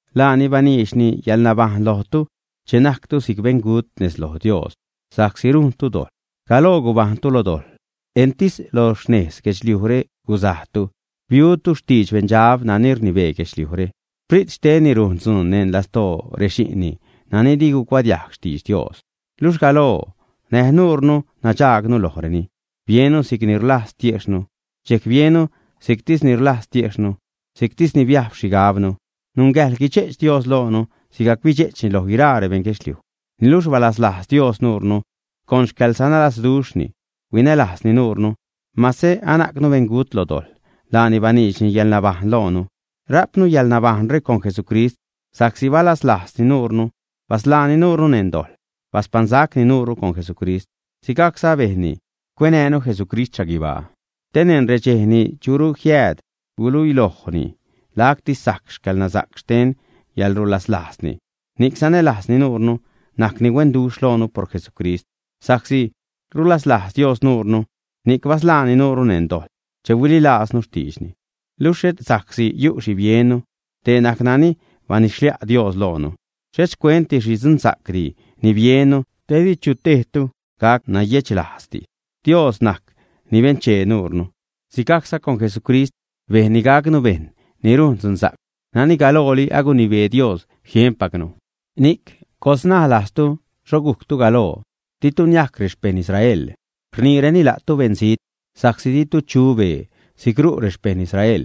Laani baniidxni yäḻnabajṉ lojtu che najctu si'c beṉgut nez loj Dios sa'csi rujntu dojḻ. Galoo gubajṉtu lo dojḻ, entis lo xnez guedxliujre guzajtu, biutu xtidx beṉdxab nani rnibee guedxliujre. Sprit xtenni rujn dzuun neṉ lastoo rexi'nni nani di gucuadiajg xtidx Dios. Luxh galoo, näj nuure nadxaagnu lojreni, biennu si'c ni rlajz tiejxhnu. Dxejc biennu si'ctisni rlajz tiejxhnu, si'ctisni biajb xhigabnu. Nungäjḻ guidxe'ch Dios loonu, sigajc bidxe'chni loj guiraa rebeṉ guedxliuj. Niluxh balaslajz Dios nuure. Con xcäḻsanälazduxhni huinälajzni nuure. Mase anajcnu beṉgut lo dojḻ, laani baniidxni yäḻnabajṉ loonu. Rajpnu yäḻnabajṉre con Jesucrist. Sa'csi balaslajzni nuure basḻaani nuure neṉ dojḻ. Baspaṉsacni nuure con Jesucrist; sigajcza bejnni cuenäjnu Jesucrist xhaguibaa, te neṉ redxej ni churu jiääd, guluilojni lacti sajc xcäḻnasa'c xten yäḻrulaslajzni, ni'c sanälajzni nuure, najcni huenduxh loonu por Jesucrist. Sa'csi rulaslajz Dios nuure, ni'c basḻaani nuure neṉ dojḻ che huililajznu xtiidxni. Luxh et sa'csi yu' xhi biennu; dee najc nani banidx-xlia' Dios loonu. Xhet xcuent xhi dzunsa'cdi ni biennu, te di chu tejtu gac nayedxlajzdi. Dios najc ni benchee nuure. Sigajcza con Jesucrist bejnni gacnu bejṉ ni rujn dzunsa'c nani galooli agunibee Dios jienpacnu. Ni'c coḻsnaj lajztu xho gujctu galoo. Ditu niajc rexpejṉ Israel. Rniireni la'tu 'beṉzijt' sa'csi ditu chu bee si'c ru' rexpejṉ Israel.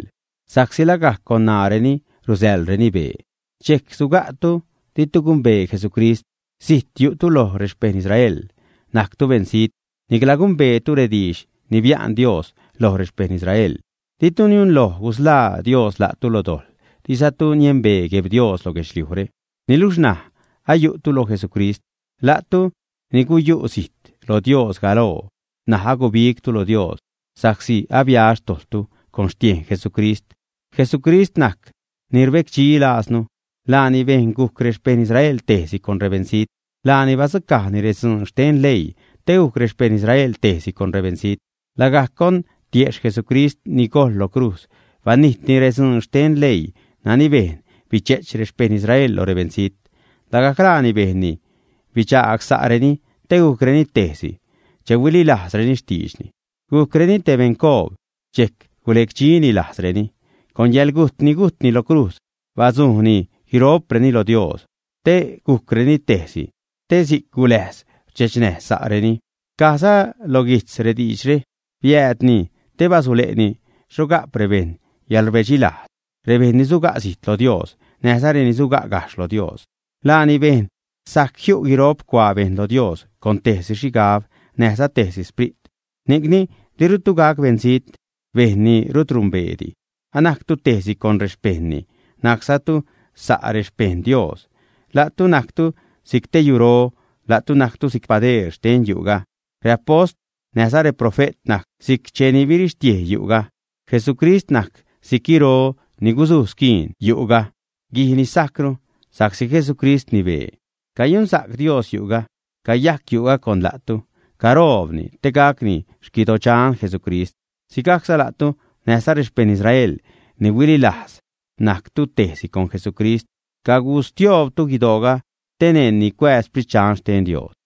Sa'csi lagajc con ṉaareni rusäḻreni bee. Dxejc suga'tu ditu gumbee Jesucrist. Zijt yu'tu loj rexpejṉ Israel, najctu beṉzijt. Nicla gumbeetu rediidx ni bia'n Dios loj rexpejṉ Israel. Ditu niunloj gusḻaa Dios la'tu lo dojḻ, dizatu niembee Gueb Dios lo guedxliujre. Niluxh ṉaj ayu'tu lo Jesucrist, la'tu ni guyu' zijt lo Dios galoo. N̲aj agubigtu lo Dios sa'csi abia xtojḻtu con xtiejn Jesucrist. Jesucrist najc ni rbecdxi lajznu. Laani bejn gujc rexpejṉ Israel tejsi con rebeṉzijt. Laani badzucajni redzuun xten leii te gujc rexpejṉ Israel tejsi con rebeṉzijt. Lagajc con tiejxh Jesucrist ni gojḻ lo crujz banijtni redzuun xten leii nani bejn bidxe'ch rexpejṉ Israel lo rebeṉzijt. Lagajc laani bejnni bidxagsa'reni te gujcreni tejsi che huililajzreni xtiidxni, gujcreni te beṉcoob. Dxejc gulecdxini lajznireni. Con yäḻgujt ni gujtni lo crujz badzu'ni guiro'preni lo Dios te gujcreni tejsi. Si'c guläjz rdxechnäj sa'reni. Cajza lo guijtz rediidxre: Biäädni te basule'ni xho ga'p rebejṉ yäḻrbedxi lajz rebejṉ ni suga' zijt lo Dios näjza reni suga' gajxh lo Dios. Laani bejn sajc jiu' guiro'p cuaa bejṉ lo Dios con tejsi xhigab, näjza tejsi Sprit. Ni'cni dirutu gac beṉzijt, bejṉ ni rut numbeedi. Anajctu tejsi con rexpejṉni, najczatu sa' rexpejṉ Dios. La'tu najctu si'c te yuro. La'tu najctu si'c padeer xten yu'ga. Reapost näjza reprofe't najc si'c cheni birixtiej yu'ga. Jesucrist najc si'c guiro ni gusuj squiin yu'ga, guij ni sajcru, sa'csi Jesucrist rnibee. Cayunsa'c Dios yu'ga, cayajc yu'ga con la'tu, caroobni te gacni xquidodxan Jesucrist. Sigajcza la'tu näjza rexpejṉ Israel ni huililajz najctu tejsi con Jesucrist. Cagustioobtu guidooga te neṉni cuääz Sprit Dxan xten Dios.